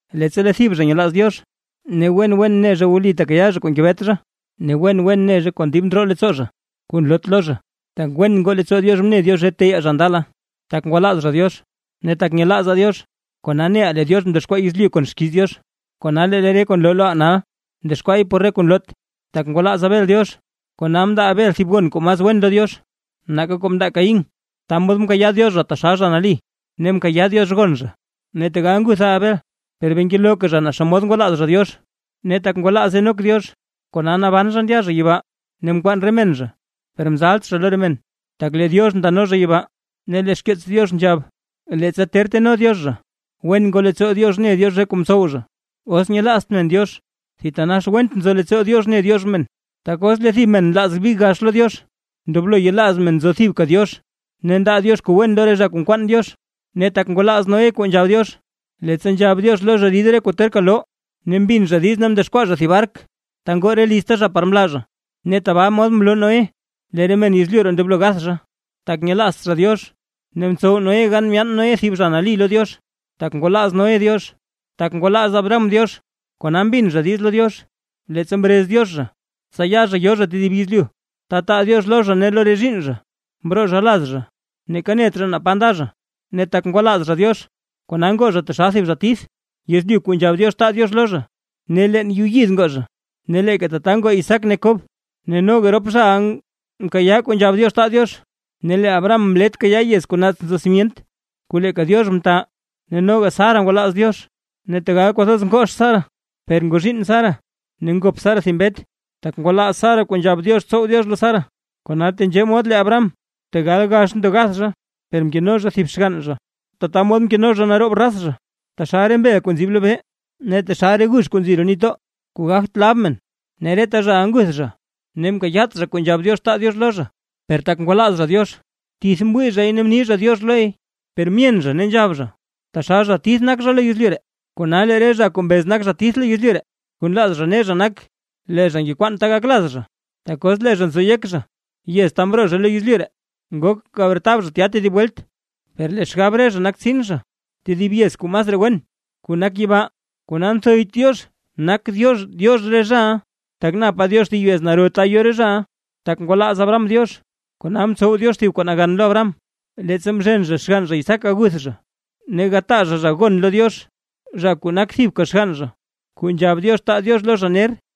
Leettsa lee thib zha nyelaaz Diox, ne wen wen ne zha wli tekayaa zha kuu ngebet zha, ne wen wen ne zha kon dib ndroo leettsoo zha kuu nloot lo zha. Tak wen ngoo leettsoo Diox mne Diox re teyaa zha ndala, tak ngwalaaz zha Diox. Ne tak nyelaazaa Diox, kona neʼaa lee Diox mdexkwaa yezlyu kon xkiiz Diox, kona lee re kuu nloo loʼaa nal, mdexkwaay por re kuu nloot. Tak ngwalaaz Abel Diox kona mndaa Abel thib gon kuu mas wen lo Diox nake kuu mndaa Caín, ta mod mkayaa Diox zha taxal zha nali, ne mkayaa Diox gon zha. Ne kona tegal ngutha Abel, per bee ngelooka zha naa xomod ngwalaaz zha Diox. Ne tak ngwalaaz Enoc Diox, kona naban zha ndya zha yibaa, ne mkwaan re men zha, per mzalt zha lo re men, tak lee Diox ndano zha yibaa. Ne lee xkeets Diox nzhab, leettsa ter teno Diox zha, wen ngoo leettsoo Diox mne Diox re kuu mtsow zha. Os nyelaazt men Diox, thitanax went nzo leettsoo Diox ne Diox men. Tak os lee thib men nlaaz big gax lo Diox, ndoblo yelaaz men nzo thibka Diox, ne ndaa Diox kuu wen lo re zha kuu nkwaan Diox. Ne tak ngwalaaz Noé kuu nzhab Diox, leettsa nzhab Diox lo zha rid re kuu terka loo, ne mbin zha diiz ne mdexkwaa zha thib bark, ta ngoo re lizta zha par mlaa zha. Ne tabaa mod mloo Noé lee re men yezlyu ree ndoblo gath zha, tak nyelaazt zha Diox, ne mtsow Noé gan myaan Noé thib zha nali lo Diox, tak ngwalaaz Noé Diox. Tak ngwalaaz Abraham Diox, kona mbin zha diiz lo Diox, leettsa mrez Diox zha, tsa ya zha yo zha tedib yezlyu, ta taa Diox lo zha ne lo re zhiinn zha. Mroo zha laz zha ne neeka net zha naa pa nda zha; ne tak ngwalaaz zha Diox, kona ngoo zha taxal thib zha tith yezlyu kuu nzhab Diox taa Diox lo zha. Ne leen yuu yid ngoo zha, ne leeka tata ngoo Isaac ne Kob, ne noga rop zhaʼa mkayaa kuu nzhab Diox taa Diox. Ne lee Abraham mlet kayaa yez kuu naats nzo simyent kuu leeka Diox mta. Ne noga Sara ngwalaaz Diox, ne tegal kwathoz ngoox Sara, per ngoo zhiinn Sara, ne ngop Sara thib mbet, tak ngwalaaz Sara kuu nzhab Diox tsow Diox lo Sara. Kona tenzhee mod lee Abraham tegal gax ndo gath zha, per mkeno zha thib xgann zha ne tata mod mkeno zha naroob raz zha, taxal re mbel kuu nzib lobee ne taxal re gux kuu nzi roo nitdoo, kuu gagt lab men. Ne reta zhaʼa nguth zha ne mkayaat zha kuu nzhab Diox taa Diox lo zha, per tak ngwalaaz zha Diox; tith mwii zhay ne mni zha “diox” loy. Per myen zha ne nzhab zha, taxal zha tith nak zha lo yezlyu ree. Kona lee re zha kuu mbez nak zha tith lo yezlyu ree, kuu nlaaz zha ne zha nak, lee zha ngekwaan ta gak laz zha. Tak os lee zha nzo yek zha yez ta mroo zha lo yezlyu ree, ngok gabretab zha tya tedib welt. Per lee xgab re zha nak tsin zha tedib yez kuu masraa wen, kuu nak yibaa. Kona nthoyt Diox nak Diox Diox re zhaʼa, tak napa Diox thib yez naro ta yo re zhaʼa. Tak ngwalaaz Abraham Diox, kona mtsow Diox thib kuu nagan lo Abraham, leettsa mzhen zha xgann zha Isaac gaguth zha ne gataa zha gon lo Diox, zha kuu nak thibka xgann zha kuu nzhab Diox taa Diox lo zha ner.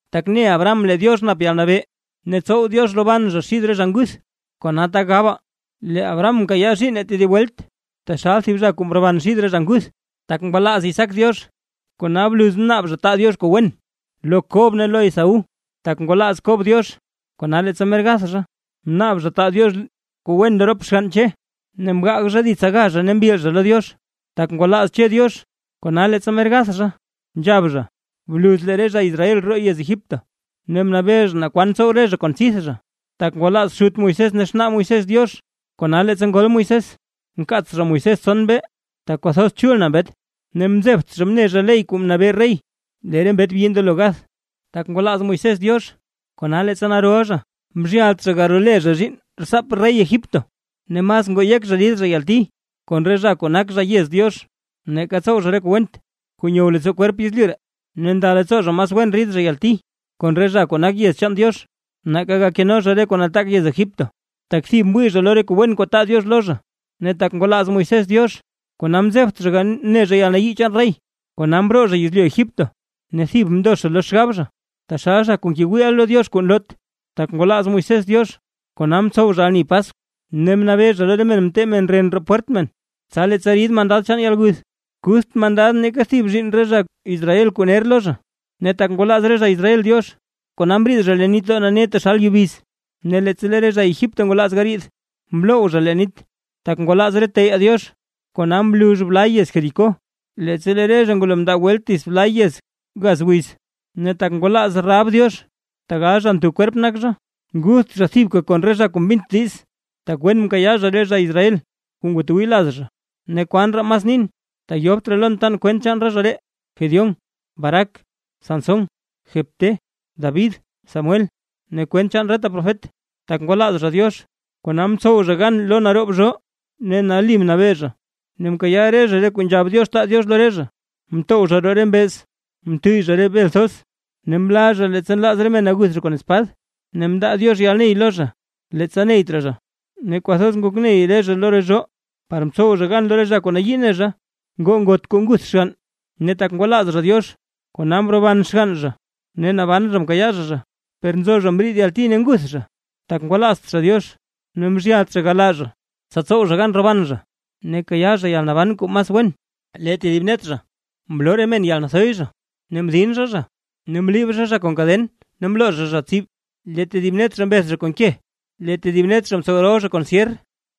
Tak ne Abraham lee Diox nap yalnabee, tsow Diox roban zha xid re zha nguth; kona tak gabaa, lee Abraham mkayaa zhiinn tedib welt taxal thib zha kuu mroban xid re zha nguth. Tak ngwalaaz Isaac Diox, kona bluz mnaab zha taa Diox kuu wen lo Kob ne lo Esaú. Tak ngwalaaz Kob Diox, kona leettsa mer gath zha, mnaab zha taa Diox re kuu wen lo rop xgann Che, ne mgaag zha dits aga zha ne mbil zha lo Diox. Tak ngwalaaz Che Diox, kona leettsa mer gath zha; nzhab zha; bluz lee re zha Israel roo yez Egipto, ne mnabee zha naa kwan tsow re zha kon tsidth zha. Tak ngwalaaz xut Moisés ne xnaa Moisés Diox, kona leettsa ngol Moisés, mkaats zha Moisés tson mbee; tak kwathoz chul na mbet, ne mzebt zha mne zha ley kuu mnabee rey lee re mbet byi ndoblo gath. Tak ngwalaaz Moisés Diox, kona leettsa naroʼa zha, mzhyalt zha garole zha zhiinn rtsaap rey Egipto; ne mas ngoo yek zha rid zha yalti, kon re zha kuu nak zha yez Diox, nake tsow zha re kuu went kuu nyow leettsoo kwerp yezlyu ree. Ne nda leettsoo zha mas wen rid zha yalti, kon re zha kuu nak yez chaan Diox, nake gakeno zha re kuu nataak yez Egipto; tak thib mwii zha lo re kuu wen kuu taa Diox lo zha. Ne tak ngwalaaz Moisés Diox, kona mzebt zha mne zha yalnayii chaan rey, kona mroo zha yezlyu Egipto, ne thib mndo zha lo xgab zha taxal zha kuu ngewii lo Diox kuu nloot. Tak ngwalaaz Moisés Diox, kona mtsow zha ani Paskw, ne mnabee zha lo re men tee re men ren roo pwert men, tsa leettsa rid mandad chaan yalguth, kutht mandad neeka thib zhiinn re zha Israel kuu ner lo zha. Ne tak ngwalaaz re zha Israel Diox, kona mriid zha leen nitdoo nane taxal yubiz; ne leettsa lee re zha Egipto ngwalaaz gariid, mloww zha leen nit. Tak ngwalaaz re teyaa Diox, kona mlux bla yez Jericó, leettsa lee re zha ngwalo mndaa welt dita dits bla yez gaz wiz. Ne tak ngwalaaz Rahab Diox, tegal zha ntho kwerp nak zha, ngutht zha thibka kon re zha kuu mbint diiz, tak wen mkayaa zha re zha Israel kuu ngwatwii laz zha. ¿Ne kwan raa mas nin? Tak yobt raa lon tan kwent chaan re zha ree; Gedeón, Barac, Sansón, Jefté, David, Samuel ne kwent chaan reta profet. Tak ngwalaaz zha Diox, kona mtsow zha gan lo naroob zhoo, ne nali mnabee zha, ne mkayaa re zha kuu nzhab Diox taa Diox lo re zha, mtow zha roo re mbeez, mtuyy zha bel thoz, ne mla zha leettsa nlaaz re men aguth zha kon espad, ne mndaa Diox yalney lo zha leettsa neyt raa zha, ne kwathoz ngok ney re zha lo re zhoo, par mtsow zha gan lo re zha kuu nayii ne zha. Ngoo ngot kuu nguth xgann, ne tak ngwalaaz zha Diox, kona mroban xgann zha ne naban zha mkayaa zha zha. Per nzo zha mriid yalti ne nguth zha, tak ngwalaazt zha Diox ne mzhyalt zha galaa zha, tsa tsow zha gan roban zha ne kayaa zha yalnaban kuu mas wen. Lee tedib net zha, mloo re men yalnathoy zha ne mdin zha zha, ne mliib zha zha kon kaden ne mloo zha zha tsib. Lee tedib net zha mbeth zha kon ke, lee tedib net zha mtsow rol zha kon syer,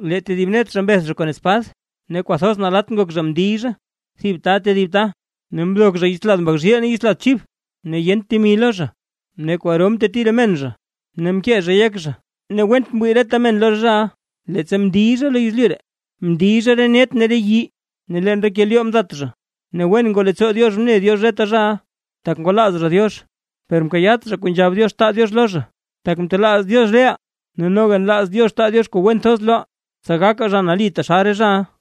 lee tedib net zha mbeth zha kon spad; ne kwathoz nalatt ngok zha mndiy zha thib ta tedib ta, ne mdok zha yits lad mbak zhiil ne yits lad chib, ne yent temi lo zha, ne kwaro mteti re men zha ne mkee zhay yek zha. Ne went mwii reta men lo re zhaʼa, leettsa mndiy zha lo yezlyu ree, mndiy zha re net ne re yii ne leen re kelyoo mdat zha. Ne wen ngoo leettsoo Diox mne Diox reta zhaʼa, tak ngwalaaz zha Diox, per mkayaat zha kuu nzhab Diox taa Diox lo zha; tak mtelaaz Diox reʼaa, ne noga nlaaz Diox taa Diox kuu wen thoz loʼaa, tsa gakaa zha nali taxal re zhaʼa.